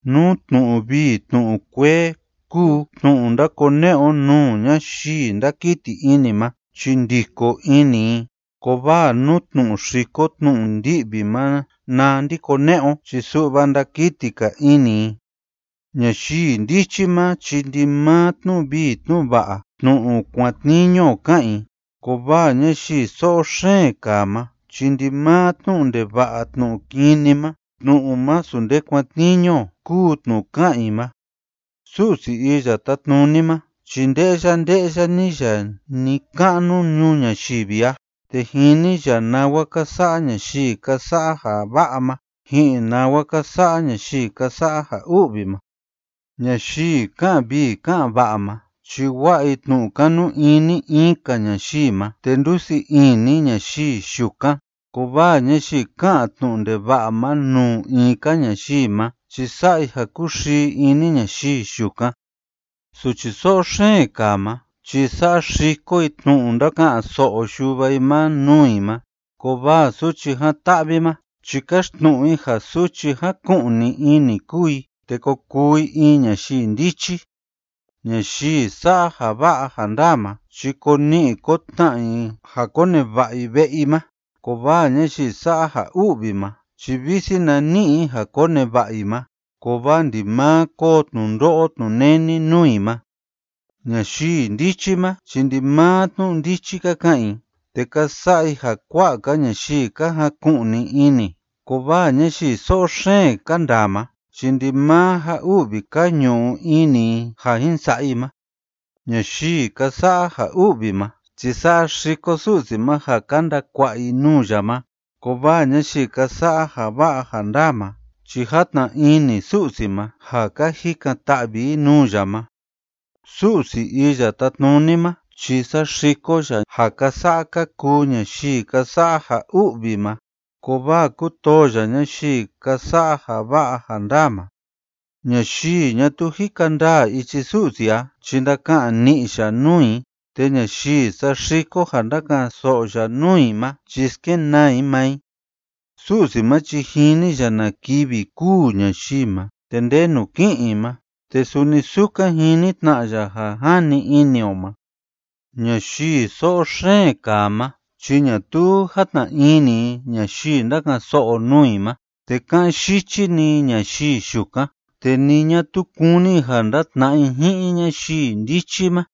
Nú tnu'u vii tnu'u kuee kúu tnu'u ndákone'e o nuu ñayii ndákiti ini ma chi ndiko ini i, kovaa nú tnu'u xiko tnu'u ndi'vi ma na ndakone'e o chi su'va ndakiti‑ka ini i. Ñayii ndichi ma chi ndimaa tnu'u vii tnu'u va'a, tnu'u kuatniñu o ká'an i, kovaa ñayii so'o xeen kaa ma chi ndimaa tnu'u ndeva'a tnu'u kini ma, tnu'u masu nde kuatniñu o kúu tnu'u ká'an i ma. Su'si Iya Tátnuni ma chi nde'ya nde'ya‑ni ya ni‑ka'nu ñuu ñayivi a, te jini ya nawa ka sa'a ñayii ka sa'a ja va'a ma ji'in nawa ka sa'a ñayii ka sa'a ja u'vi ma. Ñayii ká'an vii ká'an va'a ma chi wa'a i tnu'u kanu ini in‑ka ñayii ma, te ndusii ini ñayii yukan, kovaa ñayii ká'an tnu'u ndeva'a ma nuu in‑ka ñayii ma chi sa'a i ja kúxii ini ñayii yukan. Suchi so'o xeen kaa ma chi saxiko i tnu'u ndáka'an‑so'o yuva i ma nuu i ma, kovaa suchi jan‑ta'vi ma chi káxtnu'u i ja suchi jáku'ni ini kúu i te ko kuu i in ñayii ndichi. Ñayii sa'a ja va'a ja ndaa ma chi ko ni'i ko tna'a i ja koneva'a i ve'e i ma, kovaa ñayii sa'a ja u'vi ma chi visi na ni'i i ja koneva'a i ma, kovaa ndimaa koo tnundo'o tnuneni nuu i ma. Ñayii ndichi ma chi ndimaa tnu'u ndichi ka ka'an i te ka sa'a i ja kua'a‑ka ñayii ka jaku'ni ini, kovaa ñayii so'o xeen ka ndaa ma chi ndimaa ja u'vi ka ñu'u ini i ja jin sa'a i ma. Ñayii ka sa'a ja u'vi ma chi saxiko Su'si ma ja ka ndakua'a i nuu ya ma, kovaa ñayii ka sa'a ja va'a ja ndaa ma chi játna ini Su'si ma ja ka jikan‑ta'vi i nuu ya ma. Su'si Iya Tátnuni ma chi saxiko ya ja ka sa'a ka kuu ñayii ka sa'a ja u'vi ma, kovaa kútoo ya ñayii ka sa'a ja va'a ja ndaa ma. Ñayii ñatuu jika ndaa ichi Su'si a chi ndaka'an ni'i ya nuu i, te ñayii saxiko ja ndáka'an‑so'o ya nuu i ma chi skenaa i maa i. Su'si ma chi jini ya na kivi kûu ñayii ma te ndenu ki'in i ma, te suni sukan jini tna ya ja jani ini o ma. Ñayii so'o xeen kaa ma chi ñatuu játna ini i ñayii ndáka'an‑so'o nuu i ma, te ká'an yichi‑ni i ñayii yukan, te ni ñatuu kúni i ja ndatna'a i ji'in ñayii ndichi ma.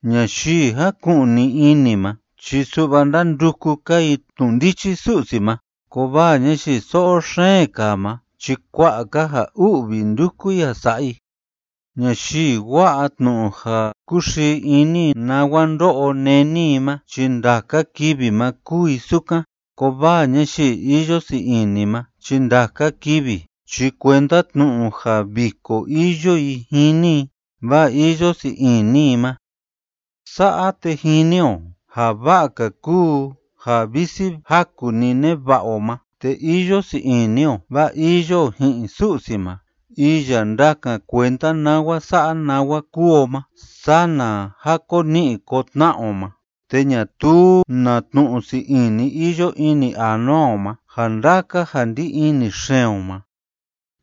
Ñayii jáku'ni ini ma chi su'va ndánduku‑ka i tnu'u ndichi Su'si ma, kovaa ñayii so'o xeen kaa ma chi kua'a‑ka ja u'vi ndúku i ja sa'a i. Ñayii wa'a tnu'u ja kúxii ini i nawa ndo'o neni i ma chi ndaka kivi ma kúu i sukan, kovaa ñayii iyo sii ini ma chi ndaka kivi chi kuenda tnu'u ja viko iyo i jini i, vaa iyo sii ini i ma. Sa'a te jini o ja va'a‑ka kúu ja visi jaku‑ni neva'a o ma, te iyo sii ini o vaa iyo o ji'in Su'si ma iya ndakan kuenda nawa sa'a nawa kúu o ma, sana ja ko ni'i ko tna'a o ma te ñatuu na tnu'u sii ini iyo ini anua o ma ja ndaka ja ndí ini xeen o ma.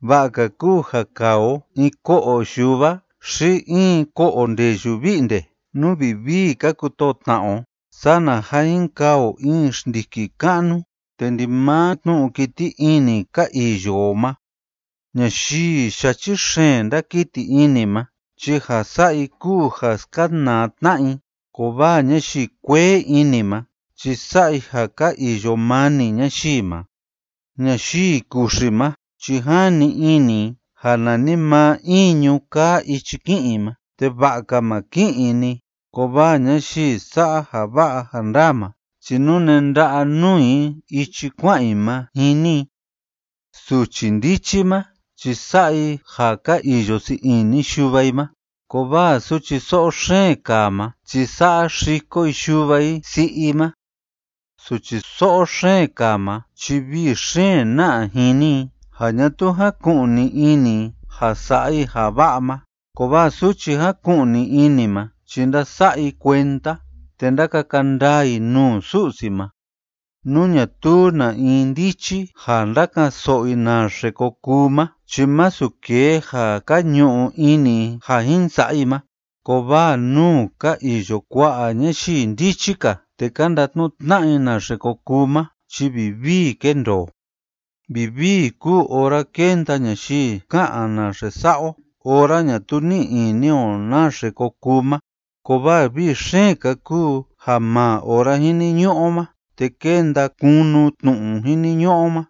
Va'a‑ka kúu ja kaa o in ko'o yuva xi in ko'o ndeyu vi'nde nú vivii ka kutoo tna'a o, sana ja jin kaa o in xndiki ka'nu te ndimaa tnu'u kiti ini ka iyo o ma. Ñayii yachi xeen ndákiti ini ma chi ja sa'a i kúu ja skanaa tna'a i, kovaa ñayii kuee ini ma chi sa'a i ja ka iyo mani ñayii ma. Ñayii kuxi ma chi jani ini i ja nanimaa iñu kaa ichi ki'in i ma te va'a‑ka ma ki'in i‑ni, kovaa ñayii sa'a ja va'a ja ndaa ma chi nune nda'a nuu i ichi kua'an i ma jini i. Suchi ndichi ma chi sa'a i ja ka iyo sii ini yuva i ma, kovaa suchi so'o xeen kaa ma chi saxiko i yuva i si'i i ma. Suchi so'o xeen kaa ma chi vii xeen na'a jini i ja ñatuu jaku'ni ini i ja sa'a i ja va'a ma, kovaa suchi jáku'ni ini ma chi ndása'a i kuenda te ndákaka ndaa i nuu Su'si ma. Nú ñatuu na in ndichi ja ndaka'an‑so'o i naxe ko kuu ma chi masu kee ja ka ñu'u ini i ja jin sa'a i ma, kovaa nuu ka iyo kua'a ñayii ndichi‑ka te ka ndatnu'u tna'a i naxe ko kuu ma chi vivii kendoo. Vivii kúu ora kénda ñayii ká'an naxe sa'a o ora ñatuu ní'i ini o naxe ko kuu ma, kovaa vii xeen‑ka kúu ja maa ora jiniñu'u o ma te kénda kunu tnu'u jiniñu'u o ma.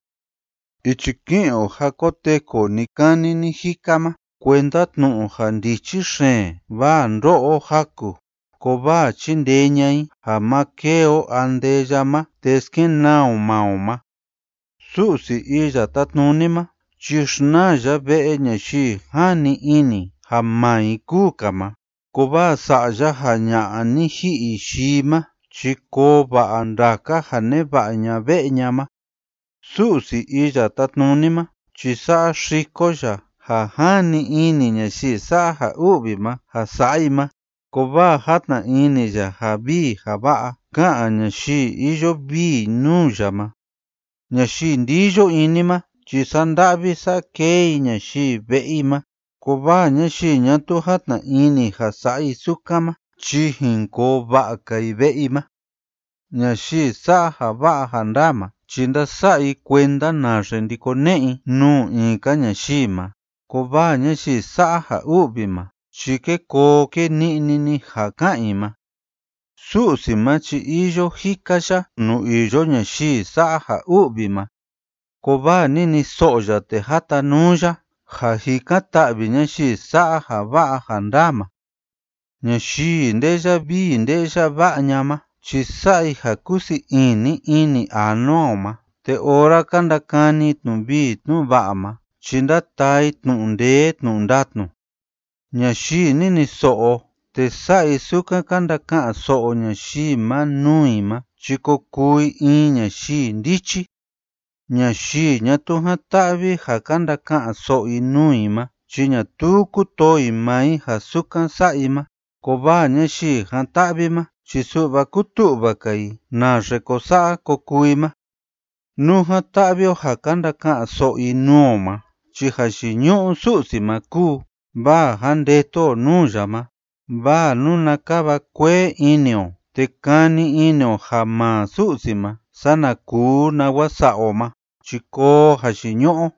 Ichi ki'in o ja koteku o ni‑kani ni‑jika ma kuenda tnu'u ja ndichi xeen, vaa ndó'o o jaku; kovaa chindee ña'a i ja ma kêe o andeya ma te skenaa o maa o ma. Su'si Iya Tátnuni ma chi xnaa ya ve'e ñayii jani ini ja maa i kúu‑ka ma, kovaa sa'a ya ja ña'a ni ji'i yii ma chi koo va'a ndaka ja neva'a ña ve'e ña ma. Su'si Iya Tátnuni ma chi saxiko ya ja jani ini ñayii sa'a ja u'vi ma ja sa'a i ma, kovaa játna ini ya ja vii ja va'a ká'an ñayii iyo vii nuu ya ma. Ñayii ndiyo ini ma chi sa'a nda'vi sa'a kee i ñayii ve'e i ma, kovaa ñayii ñatuu játna ini ja sa'a i sukan ma chi jin koo va'a‑ka i ve'e i ma. Ñayii sa'a ja va'a ja ndaa ma chi ndása'a i kuenda naxe ndakone'e i nuu in‑ka ñayii ma, kovaa ñayii sa'a ja u'vi ma chi kée koo kée ni'ni‑ni ja ká'an i ma. Su'si ma chi iyo jika ya nuu iyo ñayii sa'a ja u'vi ma, kovaa niniso'o ya te jatanuu ya ja jikan‑ta'vi ñayii sa'a ja va'a ja ndaa ma. Ñayii nde'ya vii nde'ya va'a ña'a ma chi sa'a i ja kúsii ini ini anua o ma, te ora ka ndakani i tnu'u vii tnu'u va'a ma chi ndátaa i tnu'u ndee tnu'u ndatnu. Ñayii niniso'o te sa'a i sukan ka ndaka'an‑so'o ñayii ma nuu i ma chi ko kuu i in ñayii ndichi. Ñayii ñatuu jan‑ta'vi ja ka ndaka'an‑so'o i nuu i ma chi ñatuu kútoo i maa i ja sukan sa'a i ma, kovaa ñayii jan‑ta'vi ma chi su'va kútu'va‑ka i naxe ko sa'a ko kuu i ma. Nú jan‑ta'vi o ja ka ndaka'an‑so'o i nuu o ma chi jayiñu'u Su'si ma kúu, vaa jandetu o nuu ya ma, vaa nuna kava kuee ini o te kani ini o ja maa Su'si ma sana kuu nawa sa'a o ma chi koo jayiñu'u o.